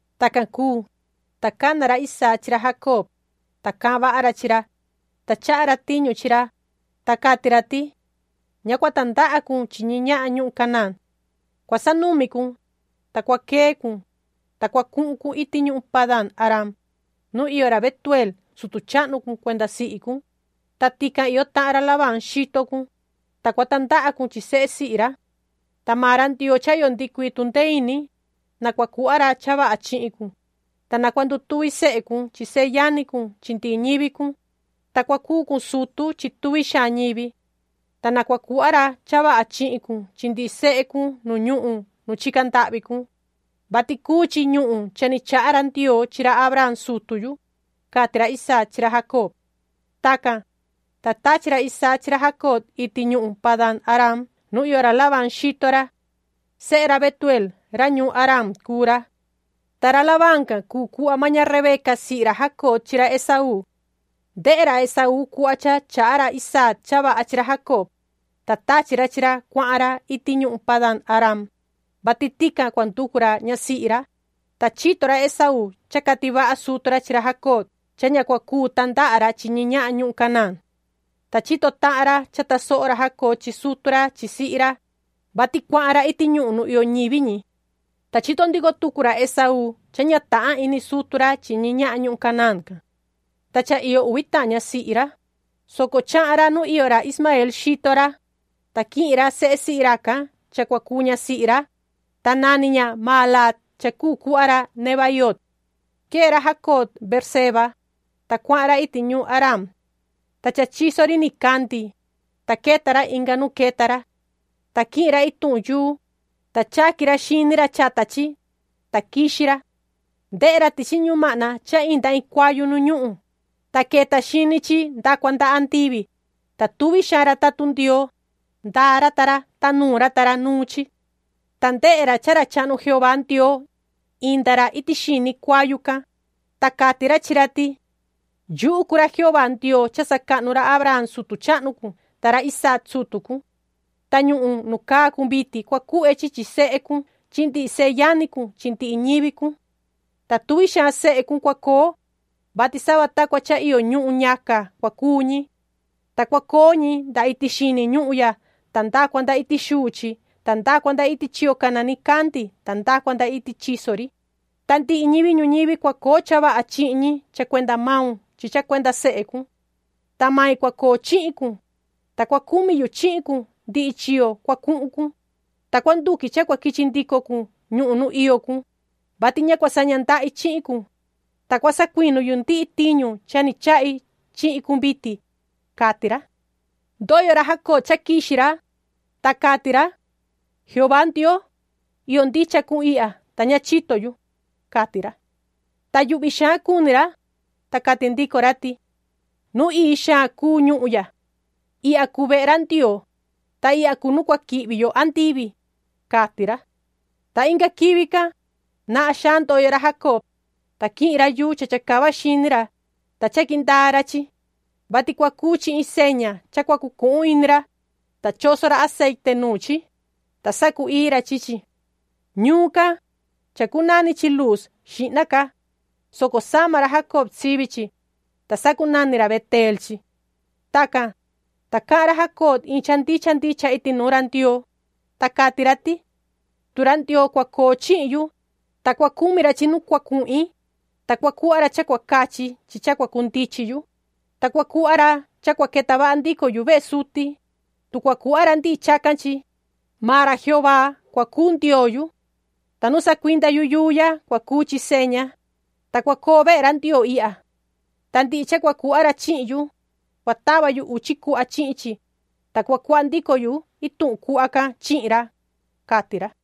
Tacan cuu, ta cana ra Isaac chi ra Jacob, ta cahan vaha ra chi ra, ta chaha ra tiñu chi ra, ta cati ra ti: “Ña cua tandaha cun chi ñi ñahan ñuhun Canaán. Cua sanumi cun, ta cua quee cun, ta cua cuhun cun iti ñuhun Padan-aram, nu iyo ra Betueel sutu chahnu cun cuenda sihi cun, ta tican iyo tahan ra Labán xito cun, ta cua tandaha cun chi sehe sihi ra. Ta maan ra Ndioo cha iyo ndihi cuii tundee ini, na cua cuhva ra cha vaha chihin cun, ta na cua ndutuvi sehe cun chi seyani cun chi ndihi ñivi cun, ta cua cuu cun sutu chi tuvi xaan ñivi. Ta na cua cuhva ra cha vaha chihin cun chi ndihi sehe cun nu ñuhun nu chica ndahvi cun, vati cuu chi ñuhun cha ni chaha ra Ndioo chi ra Abraham sutu yu”, cati ra Isaac chi ra Jacob. Tacan, ta tachi ra Isaac chi ra Jacob iti ñuhun Padaam-araam nu iyo ra Labán xito ra. Sehe ra Betueel ra ñuun Aram cuu ra. Ta ra Labán can cuu cuhva maan ña Rebeca sihi ra Jacob chi ra Esaú. Ndehe ra Esaú cuhva cha chaha ra Isaac cha vaha chi ra Jacob, ta tachi ra chi ra cuahan ra iti ñuhun Padan-aram, vati tican cua nducu ra ñasihi ra, ta chito ra Esaú cha cati vaha sutu ra chi ra Jacob cha ña cua cuu tandaha ra chi ñi ñahan ñuhun Canaán. Ta chito tahan ra cha tasoho ra Jacob chi sutu ra chi sihi ra, vati cuahan ra iti ñuhun nu iyo ñivi ñi. Ta chito ndico tucu ra Esaú cha ña tahan ini sutu ra chi ñi ñahan ñuhun Canaán can. Ta cha iyo uvi tahan ñasihi ra, soco chahan ra nu iyo ra Ismaeel xito ra, ta quihin ra sehe sihi racan cha cua cuu ñasihi ra, ta nani ña Mahalaat cha cuu cuhva ra Nebaioot. Quee ra Jacob Beerseba, ta cuahan ra iti ñuun Haraan. Ta cha chiso ri nicandi, ta queta ra inga nu queta ra. Ta quihin ra ituhun yuu, ta chaqui ra xini ra chata chi, ta quixi ra. Ndehe ra tichi ñumahna cha inda iin cuayu nu ñuhun, ta queta xini chi nda cua nda andivi, ta tuvi xaan ra tatun Ndioo, ndaa ra ta ra, ta nuun ra ta ra nuun chi. Ta ndehe ra cha ra chahnu Jehová Ndioo, inda ra iti xini cuayu can, ta cati ra chi ra ti: “Yuhu cuu ra Jehová Ndioo cha sacahnu ra Abraham sutu chahnu cun ta ra Isaac sutu cun. Ta ñuhun nu caa cun vitin cua cuhve chi chi sehe cun chi ndihi seyani cun chi ndihi ñivi cun. Ta tuvi xaan sehe cun cua coo, vati sava ta cua cha iyo ñuhun ñaca cua cuu ñi. Ta cua coo ñi nda iti xini ñuhun ya ta nda cua nda iti xuu chi ta nda cua nda iti chiyo cana nicandi ta nda cua nda iti chiso ri, ta ndihi ñivi ñuñivi cua coo cha vaha chihin ñi cha cuenda maun chi cha cuenda sehe cun. Ta mai cua coo chihin cun, ta cua cumi yu chihin cun ndihi chiyo cua cuhun cun, ta cua nduqui cha cua quichi ndico cun ñuhun nu iyo cun, vati ña cua saña ndahi chihin cun, ta cua sacuinu yu ndihi tiñu cha ni chahi chihin cun vitin”, cati ra. Ndoyo ra Jacob cha quixi ra, ta cati ra: “¡Jehová Ndioo, iyo ndicha cun ihya, ta ña chito yu!”, cati ra. Ta yuhvi xaan cuni ra, ta cati ndico ra ti: “¡Nu ii xaan cuu ñuhun ya! Ihya cuu vehe ra Ndioo, ta ihya cuu nu cua quihvi yo andivi”, cati ra. Ta inga quivi can, nahan xaan ndoyo ra Jacob, ta quihin ra yuu cha chacava xini ra, ta chaqui ndaa ra chi, vati cua cuu chi iin seña cha cua cucuhun ini ra, ta choso ra aceite nuun chi, ta sacu-ii ra chi chi. Ñuun can, chacunani chi Luuz xihna ca, soco sama ra Jacob sivi chi, ta sacunani ra Beteel chi. Tacan, ta cahan ra Jacob iin cha ndicha ndicha iti nuun ra Ndioo, ta cati ra ti: “Tu ra Ndioo cua coo chihin yu, ta cua cumi ra chi nu cua cuhin, ta cua cuhva ra cha cua cachi chi cha cua cundichin yu, ta cua cuhva ra cha cua queta vaha ndico yu vehe suti, tu cua cuhva ra ndihi chacan chi, maan ra Jehová cua cuu Ndioo yu. Ta nu sacuinda yu yuu ya cua cuu chi seña, ta cua coo vehe ra Ndioo ihya. Ta ndihi cha cua cuhva ra chihin yu, cua tava yu uchi cuhva chihin chi, ta cua cuhva ndico yu ituhun cuhva can chihin ra”, cati ra.